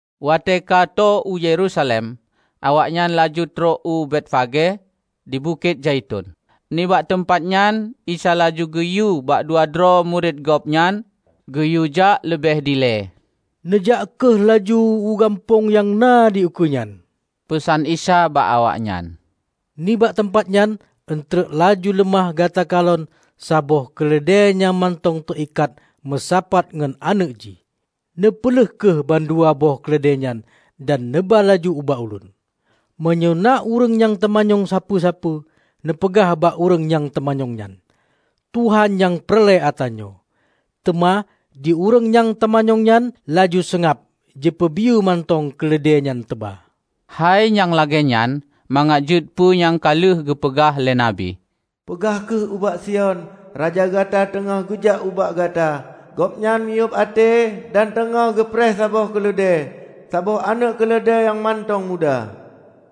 Watée ka tô u Yerusalem, awaknyan laju trok u Betfage di Bukét Zaiton. Nibak teumpat nyan Isa laju geuyue bak dua droe murit Gobnyan geuyuejak leubeh dilée. "Neujak kheueh laju u gampông nyang na dikeue nyan," peusan Isa bak awaknyan. "Nibak teumpat nyan eunteuk laju leumah gata kalon saboh keuleudée nyang mantong teu ikat meusapat ngon aneuëk jih. Neupeuleueh kheueh bandua boh keuleudée nyan dan neuba laju ubak Ulôn. Meunyoe na ureuëng nyang teumanyong sapeue-sapeue, neupeugah bak ureuëng nyang teumanyong nyan, 'Tuhan nyang peureulée atra nyoe', teuma di ureuëng nyang teumanyong nyan laju seungab jipeubiyeu mantong keuleudée nyan teuba." Hai nyang lagée nyan mangat jeuet peue nyang ka lheueh geupeugah lé nabi, "Peugah kheueh ubak Sion, Raja gata teungoh geujak ubak gata. Gobnyan miyueb até dan teungoh geupreh saboh keuleudée, saboh aneuëk keuleudée nyang mantong muda."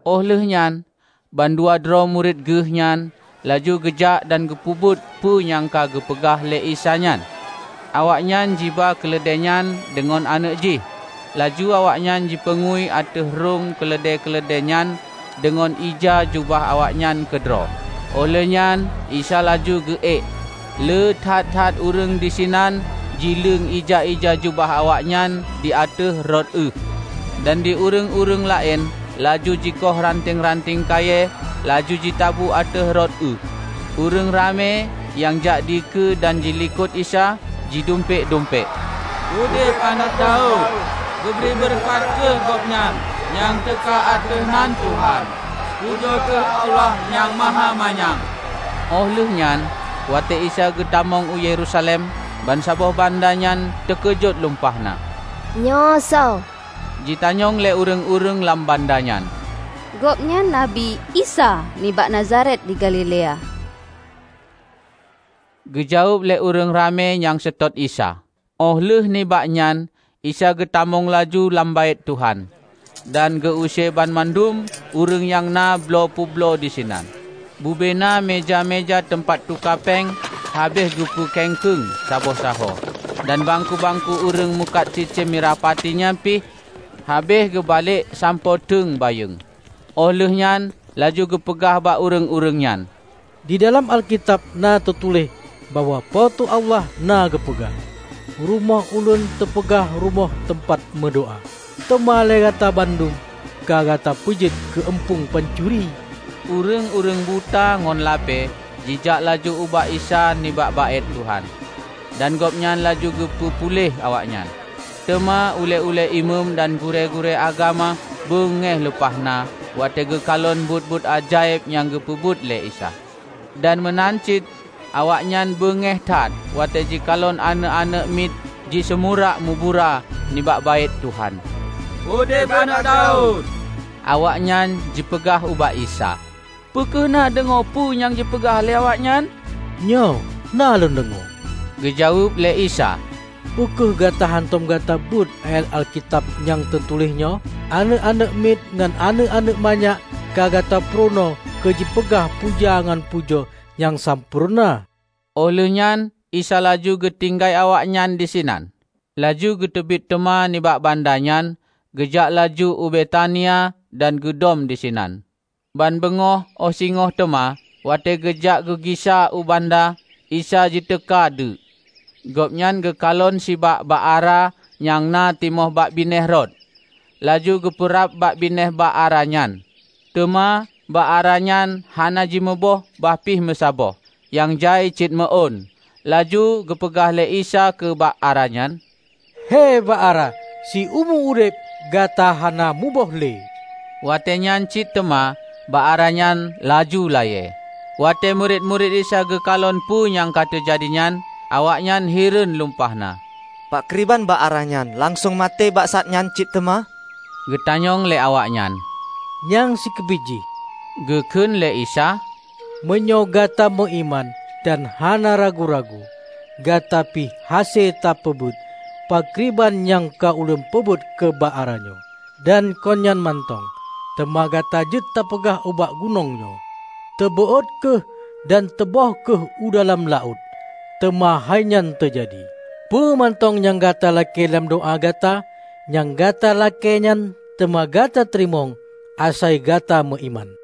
Óh lheueh nyan bandua droe murit Geuh nyan laju geujak dan geupeubuet peue nyang ka geupeugah lé Isa nyan. Awaknyan jiba keuleudéenyan deungon aneuëk jih. Laju awaknyan jipeungui ateueh rhung keuleudée-keuleudéenyan deungon ija jubah awaknyan keudroe. Oh lheuehnyan Isa laju geu ék. Le that-that ureuëng disinan jileueng ija-ija jubah awaknyan di ateueh rot ueh, dan di ureuëng-ureuëng laén laju jikoh ranteng-ranteng kayée laju jitabu ateueh rot ueh. Ureuëng ramé nyang jak dikeue dan dilikot Isa jidumpék-dumpék, "Udeb Aneuëk Daud! Geubri beureukat kheueh Gobnyan nyang teuka ateueh nan Tuhan! Pujoe kheueh Allah nyang Mahamanyang!" Óh lheueh nyan, watée Isa geutamong u Yerusalem, bansaboh banda nyan teukeujot lumpah na. "Nyoe soe?" jitanyong lé ureuëng-ureuëng lam banda nyan. "Gobnyan Nabi Isa, nibak Nazaret di Galilea," geujaweueb lé ureuëng ramé nyang seutôt Isa. Óh lheueh nibak nyan Isa geutamong laju lam Baét Tuhan, dan geu-use banmandum ureuëng nyang na bloe peubloe disinan. Bubena meuja-meuja teumpat tuka péng habéh geupeu kengkeueng saboh sahoe, dan bangku-bangku ureuëng meukat cicém mirah pati nyan pih habéh geubalek sampoe teueng bayeueng. Óh lheueh nyan laju geupeugah bak ureuëng-ureuëng nyan, "Di dalam Alkitab na teutuléh bahwa Po teu Allah na geupeugah, 'Rumoh Ulôn teupeugah rumoh teumpat meudoá.' Teuma lé gata bandum ka gata peujeuet keu eumpung pancuri!" Ureuëng-ureuëng buta ngon lapée jijak laju ubak Isa nibak Baét Tuhan, dan Gobnyan laju geupeu puléh awaknyan. Teuma ulée-ulée Imeum dan gurée-gurée agama beungéh lumpahna watée geukalon buet-buet ajaéb nyang geupeubuet lé Isa. Dan meunan cit awaknyan beungéh that watée jikalon aneuëk-aneuëk miet jiseumurak mubura nibak Baét Tuhan, "Udeb Aneuëk Daud!" Awaknyan jipeugah ubak Isa, "Peu kheueh na deungoe peue nyang jipeugah lé awaknyan?" "Nyoe, na Lôn deungoe," geujaweueb lé Isa. "Peu kheueh hántom gata beuet ayat Alkitab nyang teutuléh nyoe: 'Aneuëk-aneuëk miet ngon aneuëk-aneuëk manyak ka Gata purunoe keu jipeugah puja ngon pujoe nyang sampoereuna?' " Óh lheueh nyan Isa laju geutinggai awaknyan disinan, laju geuteubiet teuma nibak banda nyan geujak laju u Betania dan geudom di sinan. Ban beungoh óh singoh teuma, watée geujak geugisa u banda, Isa jiteuka deuek. Gobnyan geukalon sibak bak ara nyang na timoh bak binéh rot. Laju geupeurab bak binéh bak ara nyan. Teuma bak ara nyan hana jimuboh bah pih meusaboh nyang jai cit meuôn. Laju geupeugah lé Isa keu bak ara nyan, "He bak ara, siumu udeb gata hana muboh le!" Watée nyan cit teuma bak ara nyan laju layée. Watée murit-murit Isa geukalon peue nyang ka teujadi nyan, awaknyan hireuen lumpah na. "Pakriban bak ara nyan langsong maté bak saát nyan cit teuma?" geutanyong lé awaknyan. "Nyang sikeubiet jih, geukheun lé Isa, meunyoe gata meuiman dan hana ragu-ragu, gata pih hase tapeubuet pakriban nyang ka Ulôn peubuet keu bak ara nyoe. Dan kon nyan mantong, teuma gata jeuet tapeugah ubak gunong nyoe, 'teubeuôt kheueh dan teuböh kheueh u dalam laôt': teuma hai nyan teujadi. Peue mantong nyang gata lakée lam doá gata, nyang gata lakée nyan teuma gata teurimong, asai gata meuiman."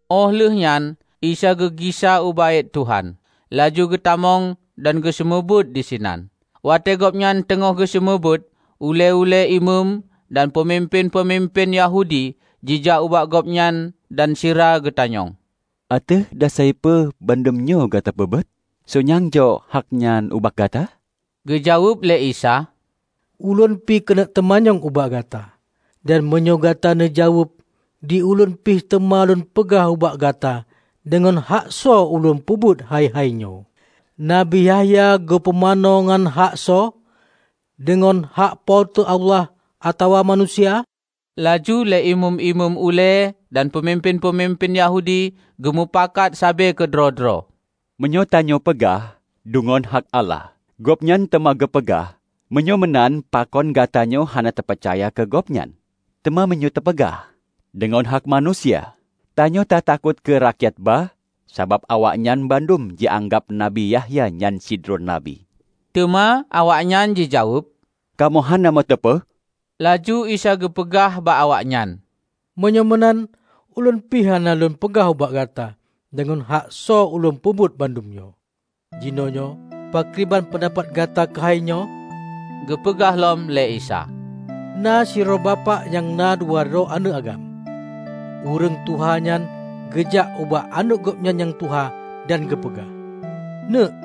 Óh lheueh nyan Isa geugisa u Baét Tuhan, laju geutamong dan geuseumeubeuet disinan. Watée Gobnyan teungoh geuseumeubeuet, ulée-ulée imeum dan peumimpén-peumimpén Yahudi jijak ubak Gobnyan dan sira geutanyong, "Ateueh dasai peue bandum nyoe gata peubuet? Soe nyang jok hak nyan ubak gata?" Geujaweueb lé Isa, "Ulôn pi keuneuk teumanyong ubak gata. Dan meunyoe gata neujaweueb, di Ulôn pih teuma Lôn peugah ubak gata deungon hak soe Ulôn peubuet hai-hai nyoe. Nabi Yahya geupumanö ngon hak soe? Deungon hak Po teu Allah atawa manusia?" Laju lé Imeum-imeum ulée dan peumimpén-peumimpén Yahudi geumeupakat sabe keudroe-droe, "Meunyoe tanyoe peugah, 'Deungon hak Allah', Gobnyan teuma geupeugah, 'Meunyoe meunan pakon gatanyoe hana tapeucaya keu Gobnyan?' Teuma meunyoe tapeugah, 'Deungon hak manusia', tanyoe ta takot keu rakyat ba, sabab awaknyan bandum jianggab nabi Yahya nyan sidroe nabi." Teuma awaknyan jijaweueb, "Kamoe hana meuteupeue." Laju Isa geupeugah bak awaknyan, "Meunyoe meunan Ulôn pih hana Lôn peugah ubak gata deungon hak soe Ulôn peubuet bandum nyoe." "Jinoenyoe pakriban peundapat gata keuhai nyoe?" geupeugah lom lé Isa. "Na sidroe bapak nyang na dua droe aneuëk agam. Ureuëng tuha nyan geujak ubak aneuëk gobnyan nyang tuha dan geupeugah, 'Neuëk,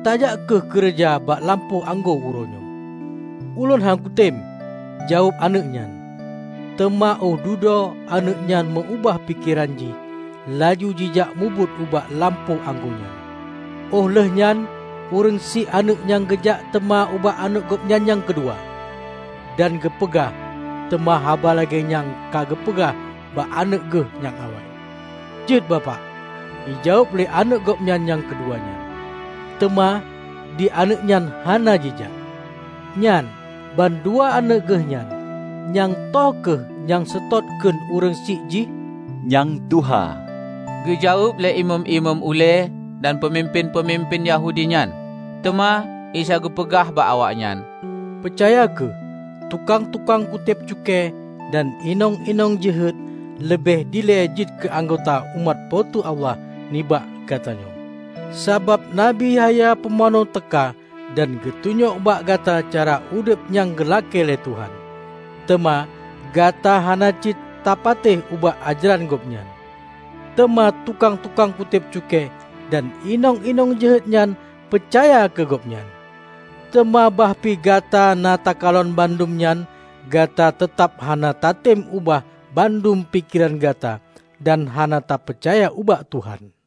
tajak kheueh keureuja bak lampôh anggô uroe nyoe.' 'Ulôn hán kutem,' jaweueb aneuëk nyan. Teuma óh dudoe aneuëk nyan meu-ubah pikeran jih laju jijak mubuet u lampôh anggô nyan. Óh lheueh nyan ureuëng syiek aneuëk nyan geujak teuma ubak aneuëk gobnyan nyang keudua, dan geupeugah teuma haba lagée nyang ka geupeugah bak aneuëk geuh nyang awai. 'Jeuet, bapak,' jijaweueb lé aneuëk gobnyan nyang keudua nyan. Teuma di aneuëk nyan hana jijak. Nyan, bandua aneuëk geuh nyan, nyang toh kheueh nyang seutôt kheun ureuëng syiek jih?" "Nyang tuha," geujaweueb lé Imeum-imeum ulée dan peumimpén-peumimpén Yahudi nyan. Teuma Isa geupeugah bak awaknyan, "Peucaya kheueh: Tukang-tukang kutéb cukée dan inong-inong jeuhet leubeh dilée jeuet keu anggota umat Po teu Allah nibak gata nyoe. Sabab Nabi Yahya Pumanö teuka, dan geutunyok bak gata cara udeb nyang geulakée lé Tuhan, teuma gata hana cit ta patéh ubak ajaran gobnyan; teuma tukang-tukang kutéb cukée dan inong-inong jeuhet nyan peucaya keu gobnyan. Teuma bah pih gata na takalon bandum nyan, gata teutab hana tatem ubah bandum pikeran gata dan hana tapeucaya ubak Tuhan."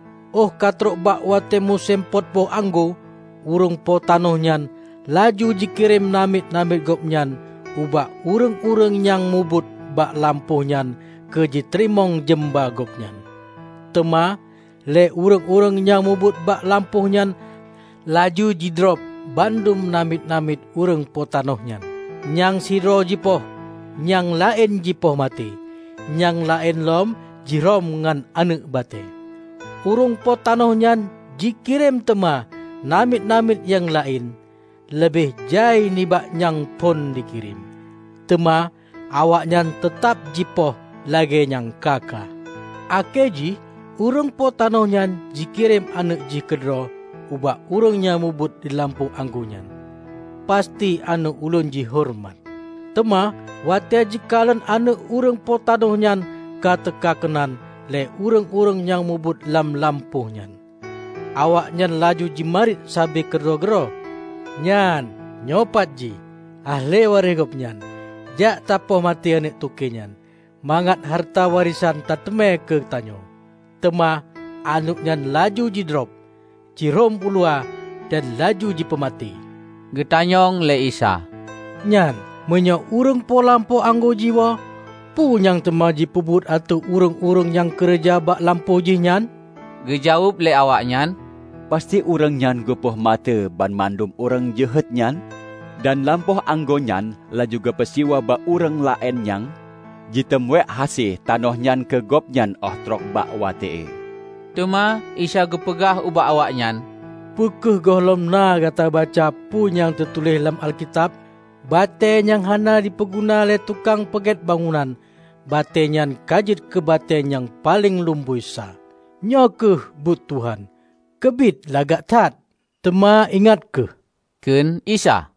Óh ka trok bak watée musém pot boh anggô, ureuëng po tanoh nyan laju jikirém namiet-namiet gobnyan ubak ureuëng-ureuëng nyang mubuet bak lampôh nyan keu jiteurimong jeumba gobnyan. Teuma lé ureuëng-ureuëng nyang mubuet bak lampôh nyan laju jidrob bandum namiet-namiet ureuëng po tanoh nyan: Nyang sidroe jipoh, nyang laén jipoh maté, nyang laén lom jirhom ngon aneuëk batée. Ureuëng po tanoh nyan jikirém teuma namiet-namiet nyang laén, leubeh jai nibak nyang phon jikirém. Teuma awaknyan teutab jipoh lagée nyang ka-ka. Akhé jih ureuëng po tanoh nyan jikirém aneuëk jih keudroe ubak ureuëng nyang mubuet di lampôh anggô nyan. 'Pasti aneuëk ulôn jihoreumat.' Teuma watée jikalon aneuëk ureuëng po tanoh nyan ka teuka keunan lé ureuëng-ureuëng nyang mubuet lam lampôh nyan, awaknyan laju jimarit sabe keudroe-droe, 'Nyan, nyoepat jih, ahli waréh gobnyan. Jak tapoh maté aneuëk toke nyan, mangat hareuta warésan tateumé keutanyoe!' Teuma aneuëk nyan laju jidrob, ji rhom uluwa, dan laju jipeumaté." Geutanyong lé Isa, "Nyan, meunyoe ureuëng po lampôh anggô jiwoe, peue nyang teuma jipeubuet ateueh ureuëng-ureuëng nyang keureuja bak lampôh jih nyan?" Geujaweueb lé awaknyan, "Pasti ureuëng nyan geupoh maté banmandum ureuëng jeuhet nyan, dan lampôh anggô nyan laju geupeusiwa bak ureuëng laén nyang jitem weuek hase tanoh nyan keu gobnyan óh trok bak watée." Teuma Isa geupeugah ubak awaknyan, "Peu kheueh gohlom na gata baca peue nyang teutuléh lam Alkitab? 'Batée nyang hana jipeuguna lé tukang peugét bangunan batée nyan ka jeuet keu batée nyang paleng lumboi sa. Nyoe kheueh buet Tuhan; keubiet lagak that!' " "Teuma, ingat kheueh," kheun Isa,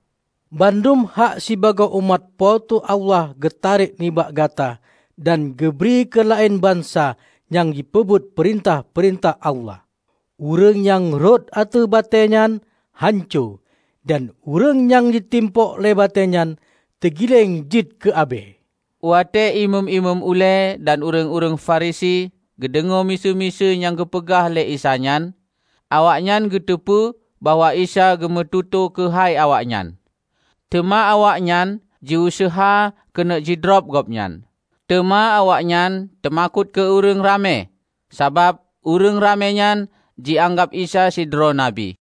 "bandum hak sibagoe umat Po teu Allah geutarek nibak gata dan geubri keu laén bansa nyang jipeubuet peurintah-peurintah Allah. Ureuëng nyang rhot ateueh batée nyan, hanco; dan ureuëng nyang jitimpok lé batée nyan, teugileng jeuet keu abée." Watée imeum-imeum ulée dan ureuëng-ureuëng Farisi geudeungoe miseue-miseue nyang geupeugah lé Isa nyan, awaknyan geuteupeue bahwa Isa geumeututoe keuhai awaknyan. Teuma awaknyan jiuseuha keuneuk jidrob Gobnyan. Teuma awaknyan teumakot keu ureuëng ramé, sabab ureuëng ramé nyan jianggab Isa sidroe nabi.